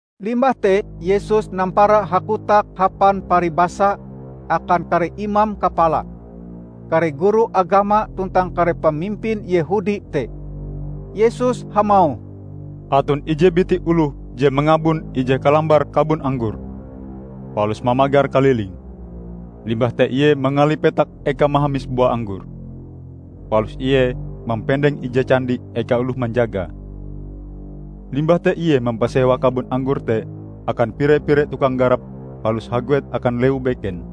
Limbah te Yesus nampara hakotak hapan paribasa akan kare imam kapala, kare guru agama tuntang kare pamimpin Yehudi te. Yesus hamauh, "Aton ije biti oloh je mangabon ije kalambar kabon anggor, palus mamagar kalilinge. Limbah te ie mangali petak ekae mahamis bua anggor, palus ie mampendeng ije candi eka oloh manjagae. Limbah te ie mampasewa kabon anggor te akan pire-pire tukang garap palus haguet akan lewu beken.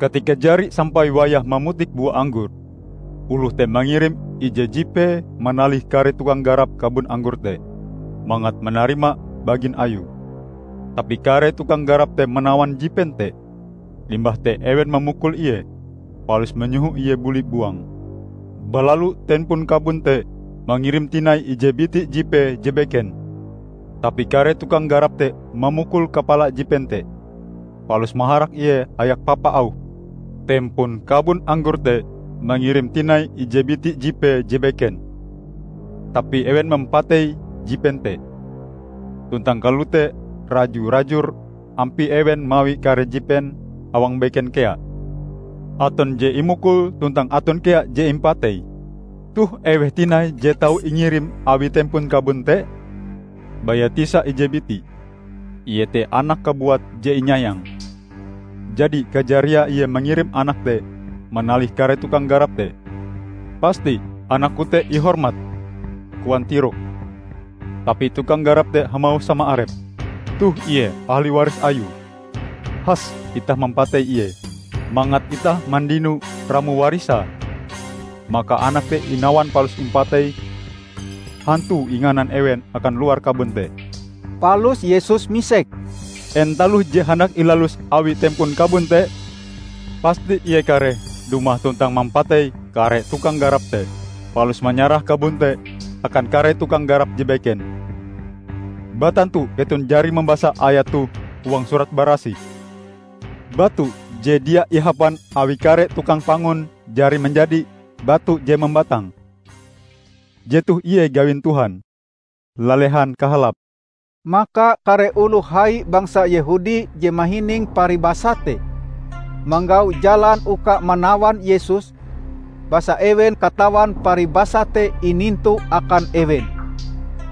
Katika jari sampai wayahe mamutik bua anggor, oloh te mangirim ije jipee manalih kare tukang garap kabon anggor te, mangat manarima bagin ayue. Tapi kare tukang garap te manawan jipen te. Limbah te ewen mamukul ie, palus manyoho ie buli buang. Balalu tempon kabon te mangirim tinai ije biti jipee je beken. Tapi kare tukang garap te mamukul kapala jipen te, palus maharak ie hayak papa auhe. Tempon kabon anggor te mangirim tinai ije biti jipee je beken. Tapi ewen mampatei jipen te. Tuntang kalote raju-rajur ampie ewen mawi kare jipen awang beken kea: aton je imukul tuntang aton kea je impatei. Toh eweh tinai je tau ingirim awi tempon kabon te? Baya tisa ije biti, iete anake kabuat je inyayange. Jadi kajariae ie mangirim anake te manalih kare tukang garap te. 'Pasti anakku te ihormat,' koan tiroke. Tapi tukang garap te hamauh sama arepe, 'Toh ie ahli waris ayue. Has itah mampatei ie, mangat itah mandino ramo warisae!' Maka anak te inawan palus impatei. Hantue inganan ewen akan luar kabon te." Palus Yesus misek, "En taloh je handak ilalus awi tempon kabon te? Pasti ie kareh dumah tuntang mampatei kare tukang garap te, palus manyarah kabon te akan kare tukang garap je beken. Batantu keton jari mambasa ayat toh huang Surat Barasih, 'Batu je dia ihapan awi kare tukang pangun jari manjadi batu je mambatang. Jetoh ie gawin Tuhan; lalehan kahalape!' " Maka kare oloh hai bangsa Yehudi je mahining paribasa te, manggau jalan uka manawan Yesus, basa ewen katawan paribasa te inintu akan ewen.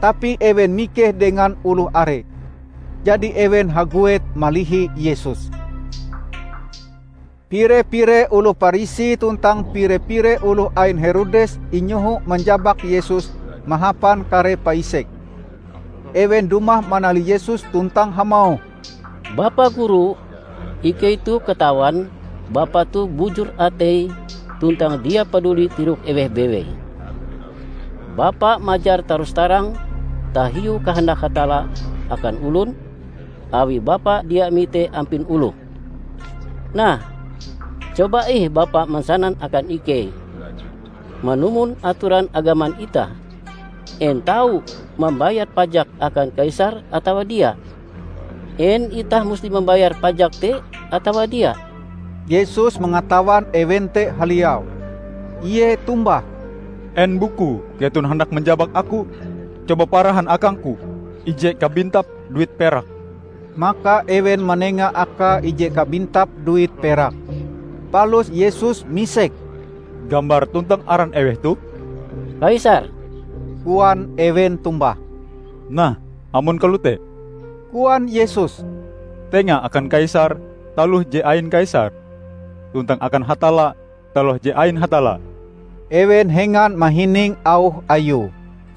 Tapi ewen mikeh dengan oloh are. Jadi, ewen haguet malihi Yesus. Pire-pire oloh Parisi tuntang pire-pire oloh ain Herodes inyoho manjabak Yesus mahapan kare paisek. Ewen dumah manalih Yesus tuntang hamauh, "Bapa Guru, ikei toh katawan Bapa toh bujur atei tuntang dia paduli tirok eweh bewei. Bapa majar tarus-tarang tahiu kahandak Hatalla akan olon, awi Bapa dia mite ampin oloh. Nah, coba ih Bapa mansanan akan ikei, 'Manumon atoran agaman itah, en tau mambayar pajak akan kaisar atawa dia? En itah musti mambayar pajak te atawa dia?' " Yesus mangatawan ewen te haliau. Ie tombah, "En bukue keton handak manjabak aku? Coba parahan akang-Ku ije kabintap duit perak." Maka ewen manenga akae ije kabintap duit perak. Palus Yesus misek, "Gambar tuntang aran eweh toh?" "Kaisar," koan ewen tombah. "Nah, amon kalote," koan Yesus, "tenga akan Kaisar taloh je ain Kaisar, tuntang akan Hatalla taloh je ain Hatalla." Ewen hengan mahining auh Ayue.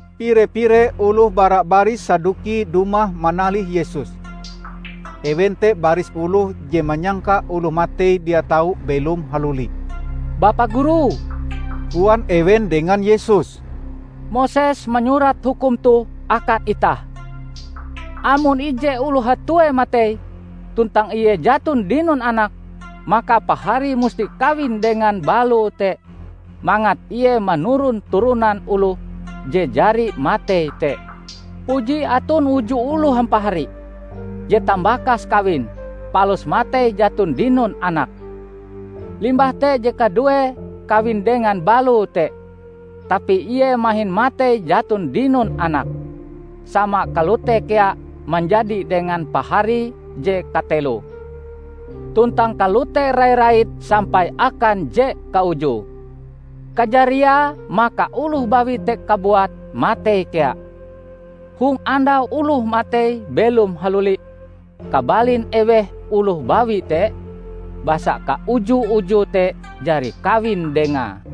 Pire-pire oloh bara baris Saduki dumah manalih Yesus. (Ewen te baris oloh je manyangka oloh matei dia tau belom haluli.) "Bapa Guru," koan ewen dengan Yesus, "Moses manyurat hukum toh akan itah: 'Amon ije oloh hatue matei, tuntang ie jaton dinon anak, maka paharie musti kawin dengan baloe te mangat ie manuron turonan oloh je jari matei te.' Puji aton uju oloh hampahari. Je tambakase kawin, palus matei jaton dinon anak. Limbah te je kaduee kawin dengan baloe te, tapi ie mahin matei jaton dinon anak. Sama kalote kea manjadi dengan paharie je katelo, tuntang kalote rai-rait sampai akan je kaujue. Kajariae maka oloh bawi te kabuat matei kea. Hong andau oloh matei belom haluli, kabalin eweh oloh bawi te? Basa kauju-ujue te jari kawin dengae!"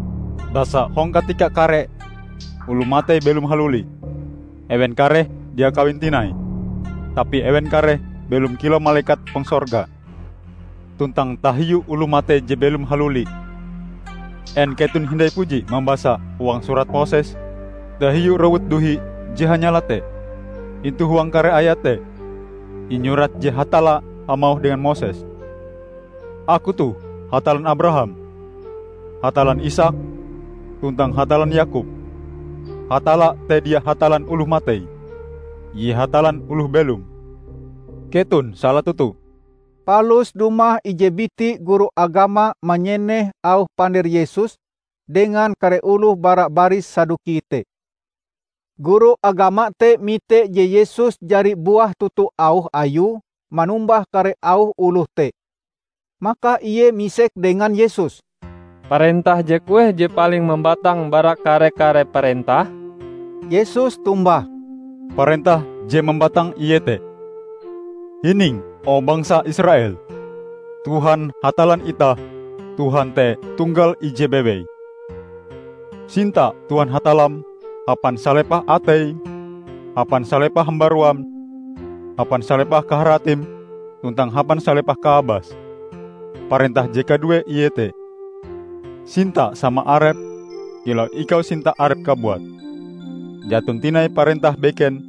Basa hong katika kare oloh matei belom haluli, ewen kareh dia kawin tinai, tapi ewen kareh belom kilau malekat hong sorga. Tuntang tahiu oloh matei je belom haluli, en keton hindai puji mambasa huang surat Moses tahiu rowut duhi je hanyala te? Intu huang kare ayat te inyurat je Hatalla hamauh dengan Moses, 'Aku toh Hatallan Abaraham, Hatallan Isaak tuntang Hatallan Yakob.' Hatalla te dia Hatallan oloh matei. Ie Hatallan oloh belom. Keton sala toto!" Palus dumah ije biti guru agama manyeneh auh pander Yesus dengan kare oloh bara baris Saduki te. Guru agama te mite je Yesus jari buah toto auh Ayue manombah kare auh oloh te. Maka ie misek dengan Yesus, "Parentah je kueh je paling mambatang bara kare-kare parentah?" Yesus tombah, "Parentah je mambatang iete: 'Hining o, bangsa Israel! Tuhan Hatallan itah, Tuhan te tunggal ije bewei. Sinta Tuhan Hatallam hapan salepah ateim, hapan salepah hambaruam, hapan salepah kaharatim tuntang hapan salepah kaabasm.' Parentah je kaduee iete: 'Sinta sama arepm kilau ikau sinta arepm kabuat.' Jaton tinai parentah beken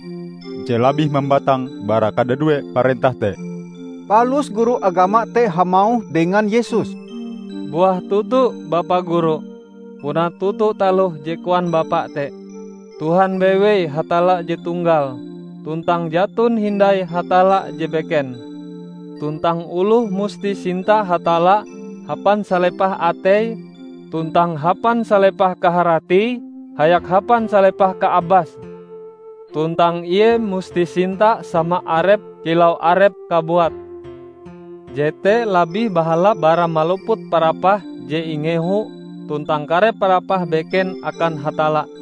je labih mambatang bara kadadue parentah te." Palus guru agama te hamauh dengan Yesus, "Buah toto, Bapa Guru! Puna toto taloh je koan Bapa te: Tuhan bewei Hatalla je tunggal, tuntang jaton hindai Hatalla je beken. Tuntang oloh musti sinta Hatalla hapan salepah ateie, tuntang hapan salepah kaharatie hayak hapan salepah kaabase. Tuntang ie musti sinta sama arepe kilau arepe kabuat. Jete labih bahalap bara maluput parapah je ingehu tuntang kare parapah beken akan Hatalla."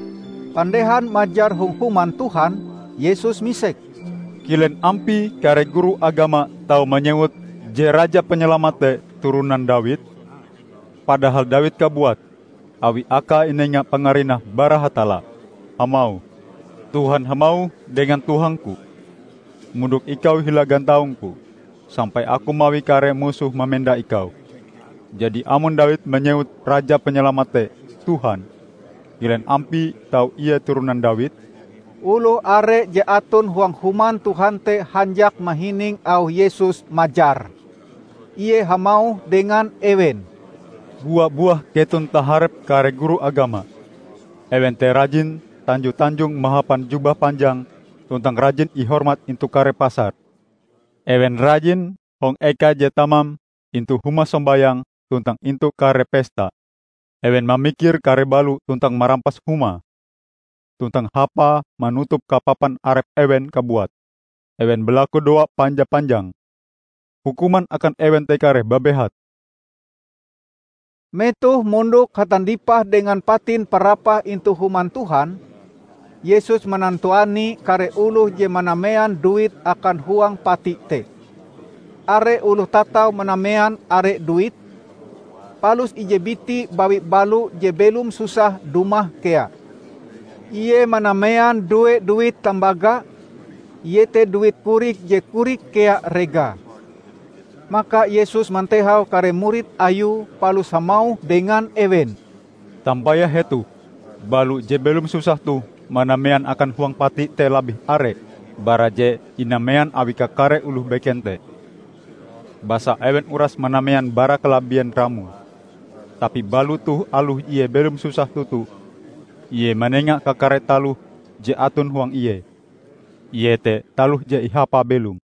Pandehan majar hong Human Tuhan, Yesus misek, "Kilen ampie kare guru agama tau manyewut je Raja Panyalamat te turonan Dawid? Padahal Dawid kabuat -- awi akae inenga pangarinah bara Hatalla -- hamauh, 'Tuhan hamauh dengan Tuhangku: mondok ikau hila gantaungku sampai aku mawi kare musohm mamenda Ikau.' Jadi, amon Dawid manyewut Raja Panyalamat te 'Tuhan', kilen ampie tau Ie turonan Dawid?" Oloh are je aton huang Human Tuhan te hanjak mahining auh Yesus majar. Ie hamauh dengan ewen, "Bua-buah keton taharep kare guru agama. Ewen te rajin tanjo-tanjong mahapan jubah panjang tuntang rajin ihormat intu kare pasar. Ewen rajin hong eka je tamam intu huma sombayang tuntang intu kare pesta. Ewen mamikir kare balo tuntang marampas humae. Tuntang hapae manutup kapapan arep ewen kabuat, ewen balakudoa panja-panjang. Hukuman akan ewen te kareh babehat!" Metoh mondok hatandipah dengan patin parapah intu Human Tuhan, Yesus manantuani kare oloh je manamean duite akan huang pati te. Are oloh tatau manamean are duit; palus ije biti bawi balo je belom susah dumah kea. Ie manamean due duit tambaga, iete duit korik je korik kea regae. Maka Yesus mantehau kare murid Ayue palus hamauh dengan ewen, "Tampayah hetoh: balo je belom susah toh manamean akan huang pati te labih are bara je inamean awi kakare oloh beken te. Basa ewen uras manamean bara kalabien ramoe. Tapi balo toh aloh ie belom susah toto, ie manenga kakare taloh je aton huang ie -- iete taloh je ihapae belom."